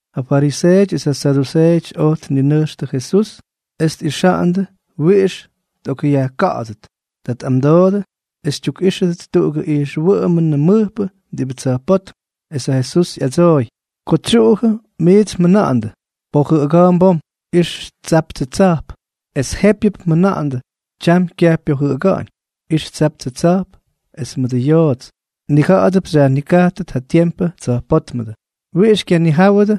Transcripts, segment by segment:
Ja fariseeʉty es ja saduseeʉty oj tninʉjxtʉ Jesús es tꞌixa̱ꞌa̱ndʉ wiꞌix tꞌokꞌyajka̱ꞌa̱dʉt. Ta tꞌamdoodʉ es tyukꞌíxʉdʉt tuꞌugʉ ijxwʉꞌʉmʉnʉ mʉjpʉ diꞌibʉ tsa̱jpótm. Es ja Jesús ꞌyadsooy: —Ko tsyuꞌujʉ miits mjʉna̱ꞌa̱ndʉ: “Pojʉꞌʉga̱a̱mp bom. Ix tsaptsʉ tsa̱jp.” Es jépyʉp mjʉna̱ꞌa̱ndʉ: “Tyam kyaj pyojʉꞌʉga̱ꞌa̱ñ. Ix tsaptsʉ tsa̱jp es mʉdʉ yoots.” Mnija̱ꞌa̱dʉp xyajnikajtʉt ja tiempʉ tsa̱jpótmʉdʉ, ¿wiꞌix xykyanijáwʉdʉ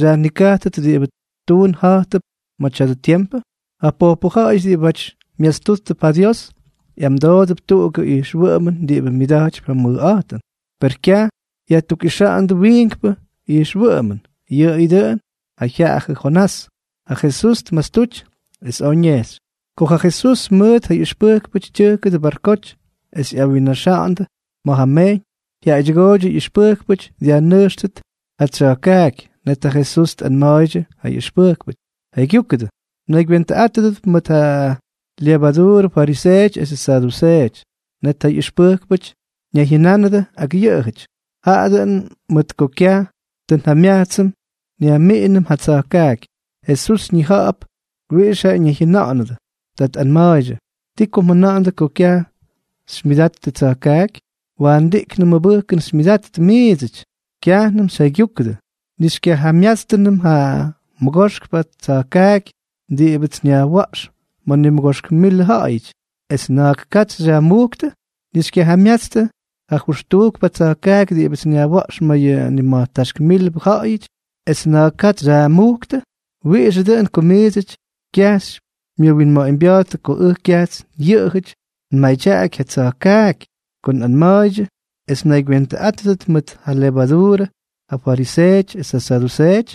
xyajnikajtʉt diꞌibʉ tuun ja̱jtʉp ma̱ tya̱dʉ tiempʉ? Ja pojpʉ ja̱ꞌa̱yʉty diꞌibʉty myastúttʉp ja Dios, ꞌyamdoodʉp tuꞌugʉ ijxwʉꞌʉmʉn diꞌibʉ myʉda̱jtypy ja mʉjꞌa̱jtʉn, per kyaj yajtukꞌixa̱ꞌa̱ndʉ wiinkpʉ ijxwʉꞌʉmʉn, yʉꞌʉyʉ dʉꞌʉn ja jyaꞌajʉ Jonás. Ta Jesús tmastuty, es oj ñejxy. Ko ja Jesús mʉt ja ꞌyʉxpʉjkpʉty tyʉjkʉdʉ barkoty es ꞌyawinnaxa̱ꞌa̱ndʉ ma̱ ja mejyñ, jyaꞌaydyʉgooydyʉ ꞌyʉxpʉjkpʉty dyajnʉjxtʉt ja tsya̱jkaaky. Net ja Jesús tꞌanma̱a̱ydyʉ ja ꞌyʉxpʉjkpʉty: —Jaygyúkʉdʉ, mnaygywentʉꞌátʉdʉp mʉt ja lyevaduurʉ fariseeʉty esʉ saduseeʉty. Net ja ꞌyʉxpʉjkpʉty ñayjyʉnánʉdʉ ak yʉꞌʉjʉty: —Jaꞌa dʉꞌʉn mʉt ko kyaj tʉ njamyajtsʉm nyajmiꞌinʉm ja tsa̱jkaaky. Jesús ñija̱ꞌa̱p wiꞌix jaꞌa ñayjyʉna̱ꞌa̱nʉdʉ, ta tꞌanma̱a̱ydyʉ: —¿Ti ko mjʉna̱ꞌa̱ndʉ ko kyaj xymyʉdattʉ tsa̱jkaaky? ¡Waandiꞌknʉ mʉbʉjkʉn xymyʉdattʉ miidsʉty! ¿Kyajnʉm xyjaygyúkʉdʉ, ni xykyajamyátstʉnʉm ja mʉgoxkpʉ tsa̱jkaaky diꞌibʉts nyajwa̱ꞌx ma̱ nimʉgoxk milʉ ja̱ꞌa̱yʉty, es na̱a̱k katsy xyꞌakꞌyajmujktʉ? ¿Ni xykyajamyatstʉ ja jʉxtujkpʉ tsa̱jkaaky diꞌibʉts nyajwa̱ꞌx ma̱ yʉ nima̱jtáxk milbʉ ja̱ꞌa̱yʉty, es na̱a̱k katsy xyꞌakꞌyajmujktʉ? ¿Wiꞌixʉ dʉꞌʉn ko miidsʉty kyaj xymyʉwinma̱ꞌa̱ñbya̱a̱ttʉ ko ʉj kyajts yʉꞌʉjʉty nmadyaꞌaky ja tsa̱jkaaky ko nꞌanma̱a̱ydyʉ es mnaygywentʉꞌátʉdʉt mʉt ja lyevaduurʉ ja fariseeʉty es ja saduseeʉty?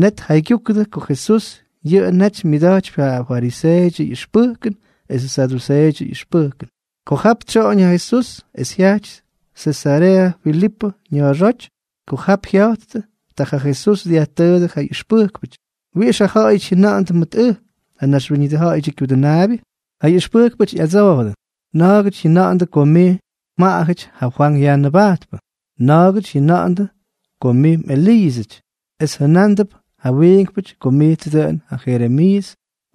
Net tjaygyujkʉdʉ ko Jesús yʉꞌʉ naty myadyakypy ja fariseeʉdyʉ ꞌyʉxpʉjkʉn esʉ saduseeʉdyʉ ꞌyʉxpʉjkʉn. Ko jap tsyoꞌoñ ja Jesús, es jyajty Sesareeʉ Filipʉ ña̱a̱xóty. Ko jap jya̱jttʉ, ta ja Jesús dyajtʉʉdʉ ja ꞌyʉxpʉjkpʉty: —¿Wiꞌix ja ja̱ꞌa̱yʉty jyʉna̱ꞌa̱ndʉ mʉt ʉj, ja Naxwíñʉdʉ Ja̱ꞌa̱yʉdyʉ Kyudʉnaabyʉ? Ja ꞌyʉxpʉjkpʉty ꞌyadsoojʉdʉ: —Na̱a̱gʉty jyʉna̱ꞌa̱ndʉ ko mij mjaꞌajʉty ja Fwank Yajnʉbajtpʉ. Na̱a̱gʉty jyʉna̱ꞌa̱ndʉ ko mꞌEliiʉsʉty, es jʉnándʉp ja wiinkpʉty ko mijtsʉ dʉꞌʉn ja Jeremiiʉs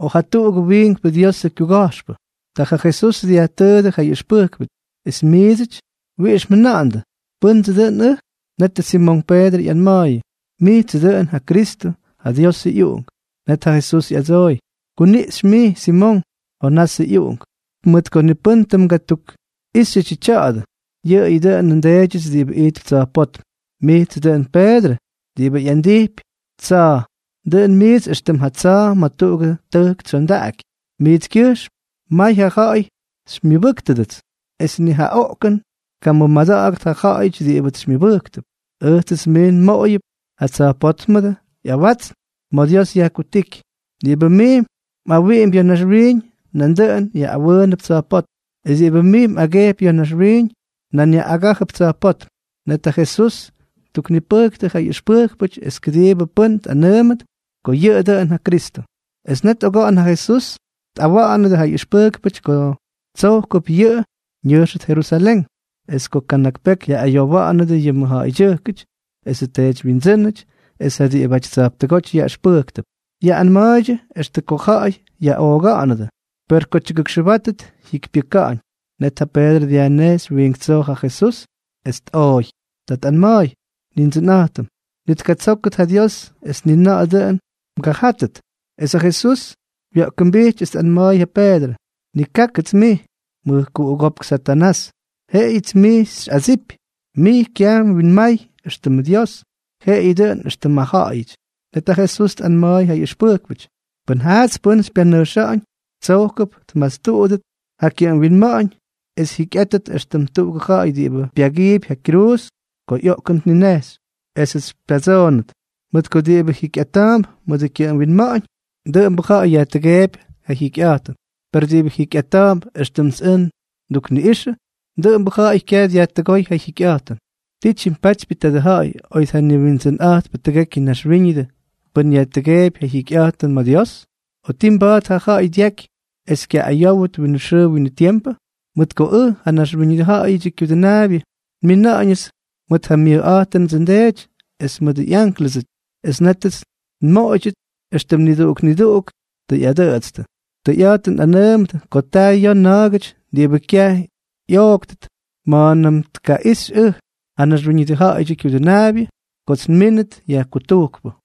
o jatuꞌugʉ wiinkpʉ Diosʉ kyuga̱jxpʉ. Ta ja Jesús dyajtʉʉdʉ ja ꞌyʉxpʉjkpʉty: —Es miidsʉty, ¿wiꞌix mjʉna̱ꞌa̱ndʉ, pʉ́ndsʉ dʉn ʉj? Netʉ Simonk Peedrʉ ꞌyanma̱a̱yʉ: —Mijtsʉ dʉꞌʉn ja Kristʉ, ja Diosʉ ꞌyUꞌunk. Net ja Jesús ꞌyadsooy: —Kuniꞌxy mij, Simonk, Jonasʉ ꞌyuꞌunk, mʉt ko ni pʉ́n tʉ mgatukꞌíxyʉdyʉ tya̱a̱dʉ, yʉꞌʉyʉ dʉꞌʉnʉ nDeedyʉts diꞌibʉ ijtp tsa̱jpótm. Mijtsʉ dʉꞌʉn Peedrʉ (diꞌibʉ ꞌyandijpy tsa̱a̱). Dʉꞌʉn mijts éxtʉm ja tsa̱a̱ ma̱ tuꞌugʉ tʉjk tsyondaꞌaky. Mijtskyʉjxm may ja ja̱ꞌa̱y xymyʉbʉ́ktʉdʉts, es ni ja oꞌkʉn tkamʉmada̱ꞌa̱gʉt ja ja̱ꞌa̱yʉty diꞌibʉts xymyʉbʉ́ktʉp. Ʉjtsʉts mij nmoꞌoyʉp ja tsa̱jpótmʉdʉ ꞌyawatsn ma̱ Dios yajkutíky. Diꞌibʉ mij mꞌawiꞌimpy ya̱ naxwiiñ, nandʉꞌʉn yaꞌꞌawʉʉnʉp tsa̱jpótm; es diꞌibʉ mij mꞌagejpy ya̱ naxwiiñ, nan yaꞌꞌagájʉp tsa̱jpótm. Net ja Jesús ttuknipʉjktʉ ja ꞌyʉxpʉjkpʉty es kʉdiibʉ pʉ́n tꞌanʉʉmʉt ko yʉꞌʉ dʉꞌʉn ja Kristʉ. Es net oga̱ꞌa̱n ja Jesús tꞌawa̱ꞌa̱nʉdʉ ja ꞌyʉxpʉjkpʉty ko tsojkʉp yʉꞌʉ ñʉjxʉt Jerusalén, es ko kana̱k peky yaꞌꞌayowa̱ꞌa̱nʉdʉ yʉ mʉjja̱ꞌa̱ydyʉjkʉty esʉ teedywyindsʉ́nʉty es ja diꞌibʉty tsa̱jptʉgóty yaꞌʉxpʉjktʉp. Yaꞌꞌanma̱a̱ydyʉ extʉ ko ja̱ꞌa̱y yaꞌooga̱ꞌa̱nʉdʉ, per ko tyʉgʉkxʉbátʉt jyikypyʉka̱ꞌa̱ñ. Net ja Peedrʉ dyajnejxy wiink tsoo ja Jesús, es tꞌooy. Ta tꞌanma̱a̱y: —Nindsʉnꞌa̱jtʉm, ¡ni tkatsókʉt ja Dios, es ni na̱ꞌa̱ dʉꞌʉn mgajátʉt! Es ja Jesús wya̱ꞌkʉmbijty es tꞌanma̱a̱y ja Peedrʉ: —¡Nikákʉts mij, mʉjkuꞌugópk Satanás! Jeꞌeyʉts mij xyꞌadsipy. Mij kyaj mwinmay éxtʉmʉ Dios, jeꞌeyʉ dʉꞌʉn éxtʉmʉ ja̱ꞌa̱yʉty. Net ja Jesús tꞌanma̱a̱y ja ꞌyʉxpʉjkpʉty: —Pʉn jaats pʉ́n xypyanʉjxa̱ꞌa̱ñ, tsojkʉp tmastuꞌudʉt ja kyʉꞌʉm winma̱ꞌa̱ñ es jyikyꞌátʉt éxtʉm tuꞌugʉ ja̱ꞌa̱y diꞌibʉ pyagiipy ja kyruuz ko ꞌyoꞌkʉn tninejxy, esʉts xypyatsoonʉt. Mʉt ko diꞌibʉ jikyꞌata̱a̱mp mʉdʉ kyʉꞌʉm winma̱ꞌa̱ñ, dʉꞌʉmbʉ ja̱ꞌa̱y yajtʉgeepy ja jyikyꞌa̱jtʉn, per diꞌibʉ jikyꞌata̱a̱mp éxtʉmts ʉj ndukniꞌꞌixʉ, dʉꞌʉmbʉ ja̱ꞌa̱y kyaj dyajtʉgóy ja jyikyꞌa̱jtʉn. ¿Ti tyimpatypyʉ tadʉ ja̱ꞌa̱y, oy tjaniwindsʉnꞌa̱jtpʉ tʉgekyʉ naxwíñʉdʉ, pʉn yajtʉgeepy ja jyikyꞌa̱jtʉn ma̱ Dios? ¿O ti mba̱a̱t ja ja̱ꞌa̱y dyaky es kyaꞌꞌayówʉt winʉ xʉʉ winʉ tiempʉ? Mʉt ko ʉj, ja Naxwíñʉdʉ Ja̱ꞌa̱yʉdyʉ Kyudʉnaabyʉ, nmina̱ꞌa̱ñʉts mʉt ja myʉjꞌa̱jtʉnʉdsʉ nDeety es mʉdʉ ꞌyánklʉsʉty, es nétʉts nmoꞌoydyʉt éxtʉm niduꞌuk niduꞌuk tʉ ꞌyadʉꞌʉtstʉ. Tʉyꞌa̱jtʉn nꞌanʉʉmʉdʉ ko ta ya̱a̱ na̱a̱gʉty diꞌibʉ kyaj ꞌyooktʉt ma̱a̱nʉm tkaꞌixy ʉj, ja Naxwíñʉdʉ Ja̱ꞌa̱yʉdyʉ Kyudʉnaabyʉ, kots nmínʉt yajkutujkpʉ.